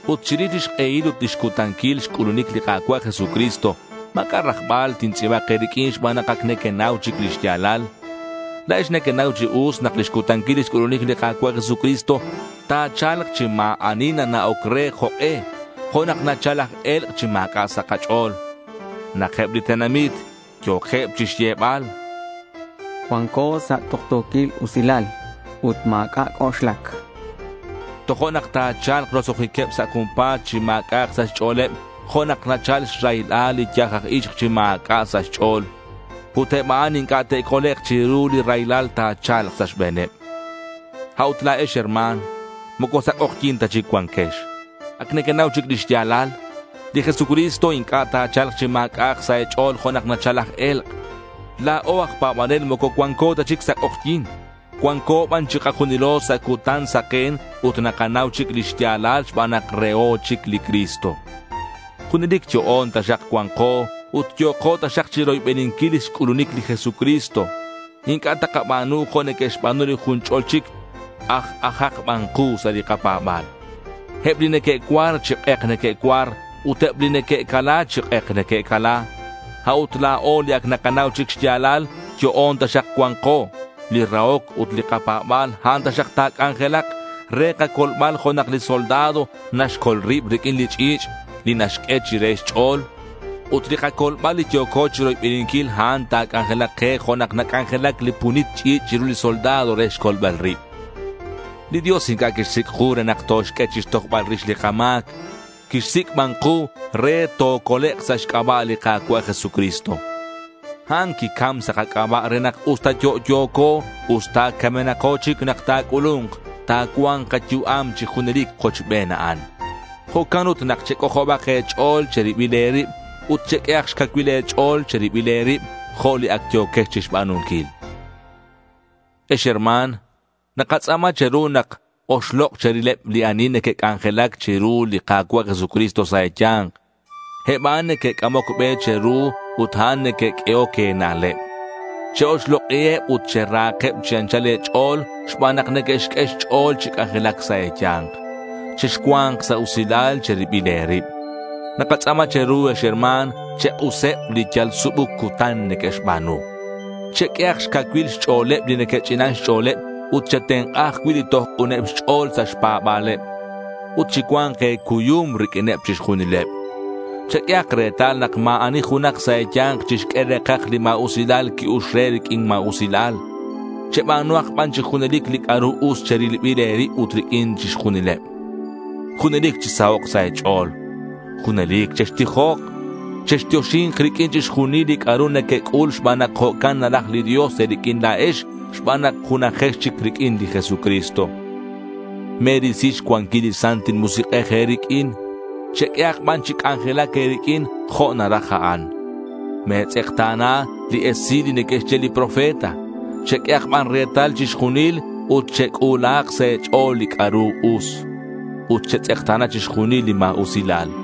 Ut chirix lix k'ehil ut lix cutanquil xc'ulunic li Ka̱cua' Jesucristo, ma̱c'a' rajbal tintz'i̱bak e̱riq'uin xban nak ac nequenau chic lix ya̱lal. La̱ex nequenau chi us nak lix cutanquil lix c'ulunic li Ka̱cua' Jesucristo, ta̱cha̱lk chi ma̱ ani nana'oc re jok'e, jo' nak nachal laj e̱lk' chi ma̱c'a' sa' kach'o̱l. Nak eb li tenamit yo̱keb chixyebal, “Cuanco sa' tuktu̱quil usilal ut ma̱c'a' c'oxlac”, tojo'nak ta̱cha̱lk roso'jiqueb sa' junpa̱t chi ma̱c'a'ak sa' xch'o̱leb jo' nak nachal xraylal li yaj aj ixk chi ma̱c'a' sa' xch'o̱l. Ut eb a'an inc'a' te'colek' chiru li raylal ta̱cha̱lk sa' xbe̱neb. A'ut la̱ex herma̱n, moco sa' k'ojyi̱n ta chic cuanquex. Ac nequenau chic lix ya̱lal. Li Jesucristo inc'a' ta̱cha̱lk chi ma̱c'a'ak sa' e̱ch'o̱l jo' nak nachal laj e̱lk'. La̱o aj pa̱banel moco cuanco ta chic sa' k'ojyi̱n. Cuanco ban chikajunilo sa' cutan saken ut nakanau chic li xya̱lal xban nak reho chic li Cristo. Junelic yo'on taxak cua̱nko ut yo̱ko taxak chiroybeninquil lix c'ulunic li Jesucristo. Inc'a' takaba̱nu jo' neque'xba̱nu li jun ch'ol chic. Aj-ajak ban ku sa' li kapa̱ba̱l. Eb li neque'cuar, chi k'ek neque'cuar ut eb li neque'cala, chi k'ek neque'cala. A'ut la̱o, li ac nakanau chic xya̱lal, yo'on taxak cua̱nko. Li rahoc ut li kapa̱ba̱l, a'an taxak ta̱c'anjelak ke re kacolbal jo' nak li soldado naxcol rib riq'uin li ch'i̱ch' li naxq'ue chire xch'o̱l. Ut li kacolbal li yo̱co chiroybeninquil, a'an ta̱c'anjelak ke jo' nak nac'anjelac li punit ch'i̱ch' chiru li soldado re xcolbal rib. Li Dios inc'a' quixsic' ku re nak toxq'ue chixtojbal rix li kama̱c. Quixsic' ban ku re tocolek' sa' xc'aba' li Ka̱cua' Jesucristo. A'an quicam sa' kac'aba' re nak usta yo'yo̱co usta ac camenako chic nak ta̱c'ulu̱nk, ta̱cua̱nk kayu'am chi junelic kochben a'an. Jo'can ut nak chec'ojob e̱ch'o̱l che̱ribil e̱rib ut cheq'uehak xcacuil e̱ch'o̱l che̱ribil e̱rib jo' li ac yo̱quex chixba̱nunquil. Ex herma̱n, nakatz'a̱ma che̱ru nak oxlok' cherileb li ani neque'c'anjelac chiru li Ka̱cua' Jesucristo sa' e̱ya̱nk. Eb a'an neque'c'amoc be che̱ru ut a'an neque'q'uehoc e̱na'leb. Che-oxlok'iheb ut cherahakeb chi anchal e̱ch'o̱l xban nak neque'xq'ue xch'o̱l chi c'anjelac sa' e̱ya̱nk. Chexcua̱nk sa' usilal che̱ribil e̱rib. Nakatz'a̱ma che̱ru, ex herma̱n, chek'useb li yal subuc cutan neque'xba̱nu. Cheq'uehak xcacuil xch'o̱leb li neque'ch'inan xch'o̱leb ut chetenk'a ajcui' li toj k'uneb xch'o̱l sa' xpa̱ba̱leb. Ut chicua̱nk e̱cuyum riq'uineb chixjunileb. Cheq'uehak retal nak ma̱ ani junak sa' e̱ya̱nk chixq'ue re̱kaj li ma̱usilal qui-ux re riq'uin ma̱usilal. Cheba̱nuhak ban chi junelic li c'a'ru us che̱ribil e̱rib ut riq'uin chixjunileb. Junelic chisahok' sa' e̱ch'o̱l. Junelic chextijok. Chextioxi̱nk riq'uin chixjunil li c'a'ru nequec'ul xban nak jo'can naraj li Dios e̱riq'uin la̱ex xban nak junajex chic riq'uin li Jesucristo. Me̱risi xcuanquil li Santil Musik'ej e̱riq'uin. Cheq'uehak ban chi c'anjelac e̱riq'uin, jo' naraj a'an. Me̱tz'ekta̱na li esil li neque'xye li profeta. Cheq'uehak ban retal chixjunil ut chec'u̱lahak sa' e̱ch'o̱l li c'a'ru us. Ut chetz'ekta̱na chixjunil li ma̱usilal.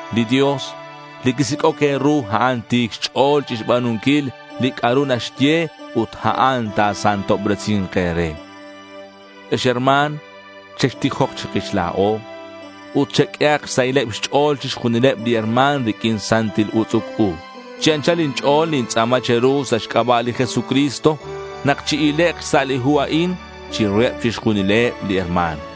Li Dios, li quisic'oc e̱ru, a'an ti̱c xch'o̱l chixba̱nunquil li c'a'ru naxye ut a'an ta̱santobresi̱nk e̱re. Ex herma̱n, chextijok chikix la̱o. Ut cheq'uehak xsahileb xch'o̱l chixjunileb li herma̱n riq'uin santil utz'uc u. Chi anchal inch'o̱l nintz'a̱ma che̱ru sa' xc'aba' li Jesucristo nak chi-ilek' xsa' li hu a'in chiruheb chixjunileb li herma̱n.